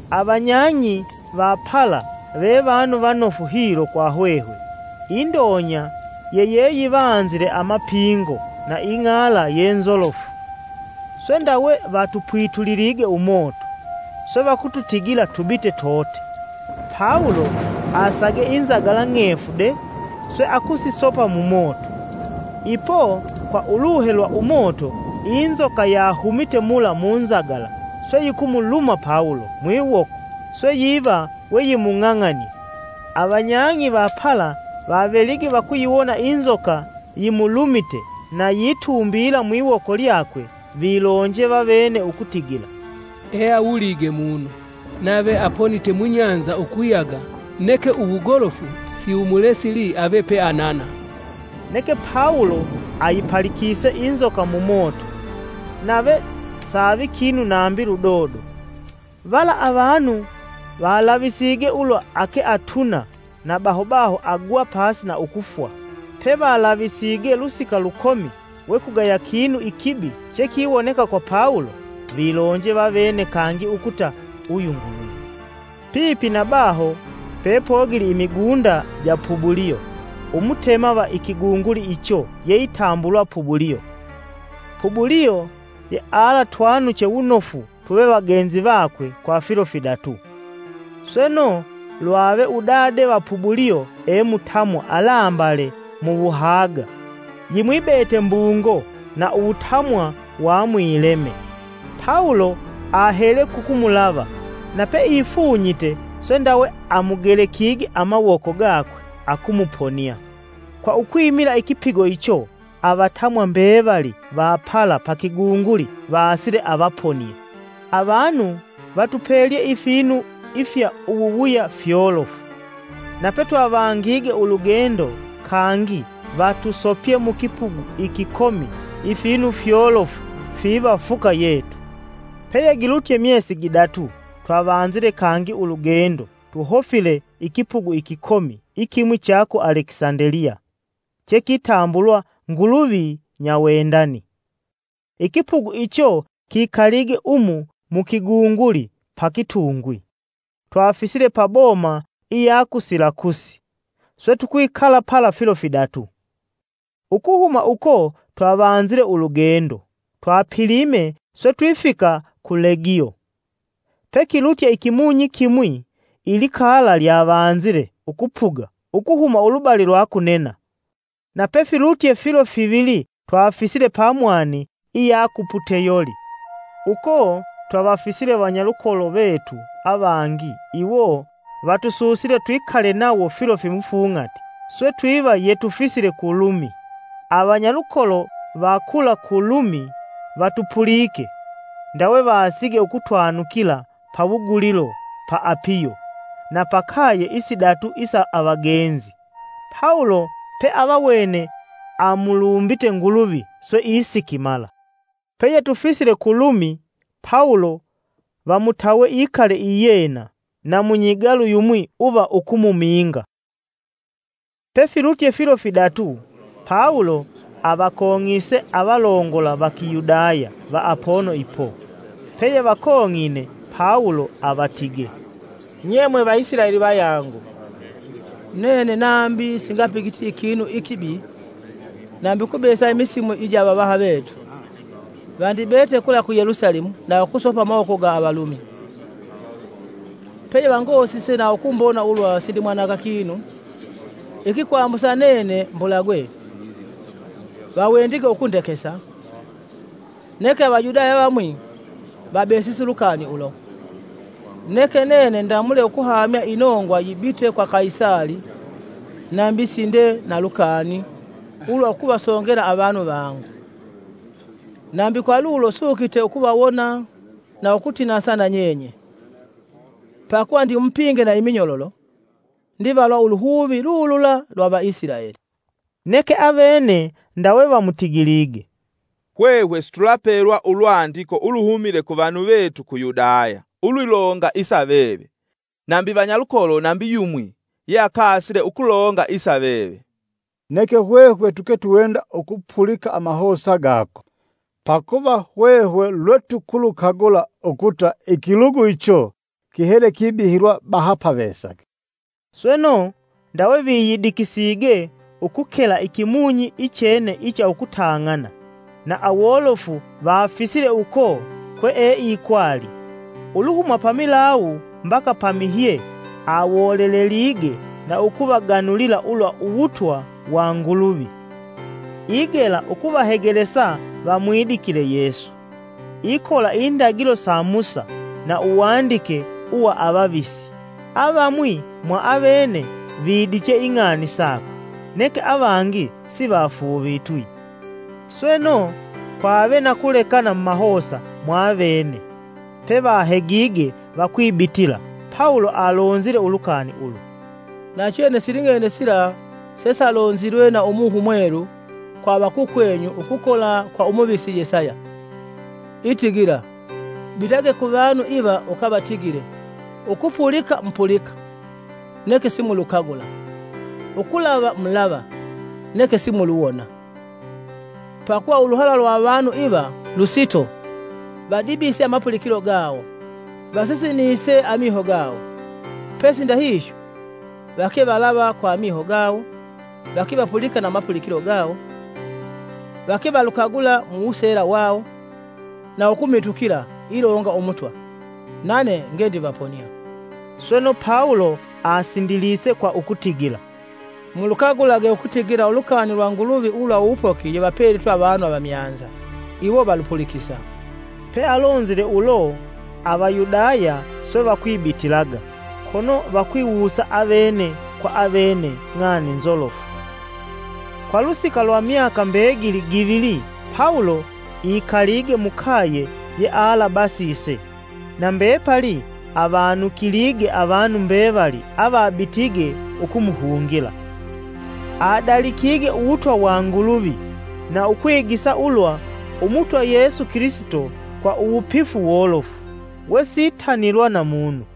Avanyang'i va pala vevanu vanofu hilo kwa hwehwe. Indonya yeyeyivanzile amapingo na ing'ala yenzolofu, swe ndawe vatupwitulilige umoto, swe vakututigila tubite tote. Pawulo asage inzagala ng'efu de swe akusisopa mumoto. Ipo, kwa uluhe lwa umoto, inzoka yahumite mula munzagala swe yikumuluma Pawulo mwiwoko swe yiva weyimung'ang'anie. Avanyang'i va pala vavelige vakuyiwona inzoka yimulumite na yitumbiila mwiwoko lyakwe vilonje vavene ukutigila, “Eawulige munu, nave aponite mubahali ukuyaga, ‘Neke uwugolofu’ siwumulesili ave peeanana!” Neke Pawulo ayipalikise inzoka mumoto, nave savi kinu nambi ludodo. Vala avanu valavisige ulwa ake atuna na baho baho agwa pasi na ukufwa. Pevalavisige lusika lukomi we kugaya kinu ikibi chekiwoneka kwa Pawulo, vilonje vavene kangi ukuta uyu nguluvi. Pipi na baho pepogili imigunda ja Pubulio, umutema va ikigunguli icho yeitambulwa Pubulio. Pubulio yealatwanuche wunofu tuve tuvagenzi vakwe kwa filo fidatu. Sweno, lwave udade va Pubulio emutamwa alambale muwuhaga yimwibete mbungo na uwutamwa wa mwileme. Pawulo ahele kukumulava na peifunyite, swe ndawe amugelekige amawoko gakwe akumuponia. Kwa ukwimila ikipigo icho, avatamwa mbevali va pala pa kigunguli vasile avaponie. Avanu vatupelye ifinu ifya uwuwuya fyolofu, na petwavangige ulugendo, kangi vatusopye mukipugu ikikomi ifinu fyolofu fiva fuka yetu. Peyegilutye myesi gidatu twavanzile kangi ulugendo tuhofile ikipugu ikikomi ikimwi cha ku Alekisandeliya chekitambulwa, “Nguluvi nyawendani.” Ikipugu icho kikalige umu mu kigunguli pa kitungwi. Twafisile pa boma iya ku Silakusi, swe tukwikala pala filo fidatu. Ukuhuma uko twavanzile ulugendo, twapilime swe twifika ku Legio. Pekilutye ikimunyi kimwi, ilikala lyavanzile ukupuga ukuhuma ulubali lwa kunena. Na pefilutye filo fivili twafisile pamwani iya ku Puteyoli. Uko twavafisile vanyalukolo vetu avangi iwo vatususile twikale nawo filo fimufung'ati, swe twiva yetufisile ku Lumi. Avanyalukolo va kula ku Lumi vatupulike, ndawe vasige ukutwanukila pawugulilo pa Apiyo na pa kaye isidatu isa avagenzi. Pawulo peavawene amulumbite Nguluvi, swe isikimala. Peyetufisile ku Lumi, Pawulo vamutawe ikale iyena na munyigalu yumwi uva ukumuminga. Pefilutye filo fidatu, Pawulo avakong'ise avalongola va Kiyudaya va apono ipo. Peyevakong'ine, Pawulo avatige, “Nye mwe Vaisilaeli vayangu, nene nambi singapigiti ikinu ikibi nambi ukubesa imisimu ija avavaha vetu. Vandibete kula ku Yelusalemu na ukusopa mumawoko ga Avalumi. Peyevangosise na ukumbona ulwa sindimwananga kinu, ikikwambusa nene mbulagwe, vawendige ukundekesa. Neke Avayudaya avamwi vabesise ulukani ulo, neke nene ndamule ukuhamya inongwa yibite kwa Kaisali nambi sinde na lukani ulwakuvasongela avanu vangu. Nambi kwa lulo sukite ukuvawona na ukutinasa na nyenye, pakuva ndimupinge na iminyololo ndivalwa uluhuvi lulula lwa Vaisilaeli.” Neke avene ndawe vamutigilige, “Hwehwe situlapelwa ulwandiko uluhumile kuvanu vetu ku Yudaya iyilonga sa veve nambi vanyalukolo nambi yumwi yeakasile ukulonga sa veve. Neke hwehwe tuketuwenda ukupulika amahosa gako. Pakuva hwehwe lwetukulukagula ukuta ikilugu icho kihele kibihilwa bahapavesaga.” Sweno, ndawe viyidikisige ukukela ikimunyi ichene icha ukutang'ana, na awolofu vafisile uko kweeikwali. Uluhuma pamilawu mbaka pamihye awolelelige na ukuvaganulila ulwa uwutwa wa Nguluvi, igela ukuvahegelesa vamwidikile Yesu ikola indagilo sa Musa na uwandike uwa avavisi. Avamwi mwa avene vidiche ing'ani sakwe, neke avangi sivafuuvitwi. Sweno, kwave na kulekana mumahosa mwavene, pevahegige vakwibitila, Pawulo alonzile ulukani ulu, “Nachene siling'ene sila sesalonzilwe na Umuhe Umwelu kwa avakukwenyu ukukola kwa Umuvisi Yesaya itigila: ‘Bitage kuvanu iva ukavatigile; ukupulika mupulika, neke simulukagula; ukulava mulava, neke simuluwona. Pakuva uluhala lwa avanu iva lusito, vadibise amapulikilo gawo, vasisinise amiho gawo. Pesi ndahihyo, vake valava kwa amiho gawo, vake vapulika na amapulikilo gawo. Vake valukagula mu wuseela wawo, na ukumitukila, ilonga Umutwa, nane ngendivaponia.’” Sweno Pawulo asindilise kwa ukutigila, “Mulukagulage ukutigila ulukani lwa Nguluvi ulwa uwupoki yevapelitwe avanu avamyanza. Iwo valupulikisa!” [ Pealonzile ulo, Avayudaya swe vakwibitilaga, kono vakwiwusa avene kwa avene ng'ani nzolofu.] Kwa lusika lwa myaka mbegili givili Pawulo ikalige mukaye yealabasise na mbepali avanukilige avanu mbevali avabitige ukumuhungila. Adalikige uwutwa wa Nguluvi na ukwigisa ulwa Umutwa Yesu Kilisito kwa uwupifu wolofu, wesitanilwa na munu.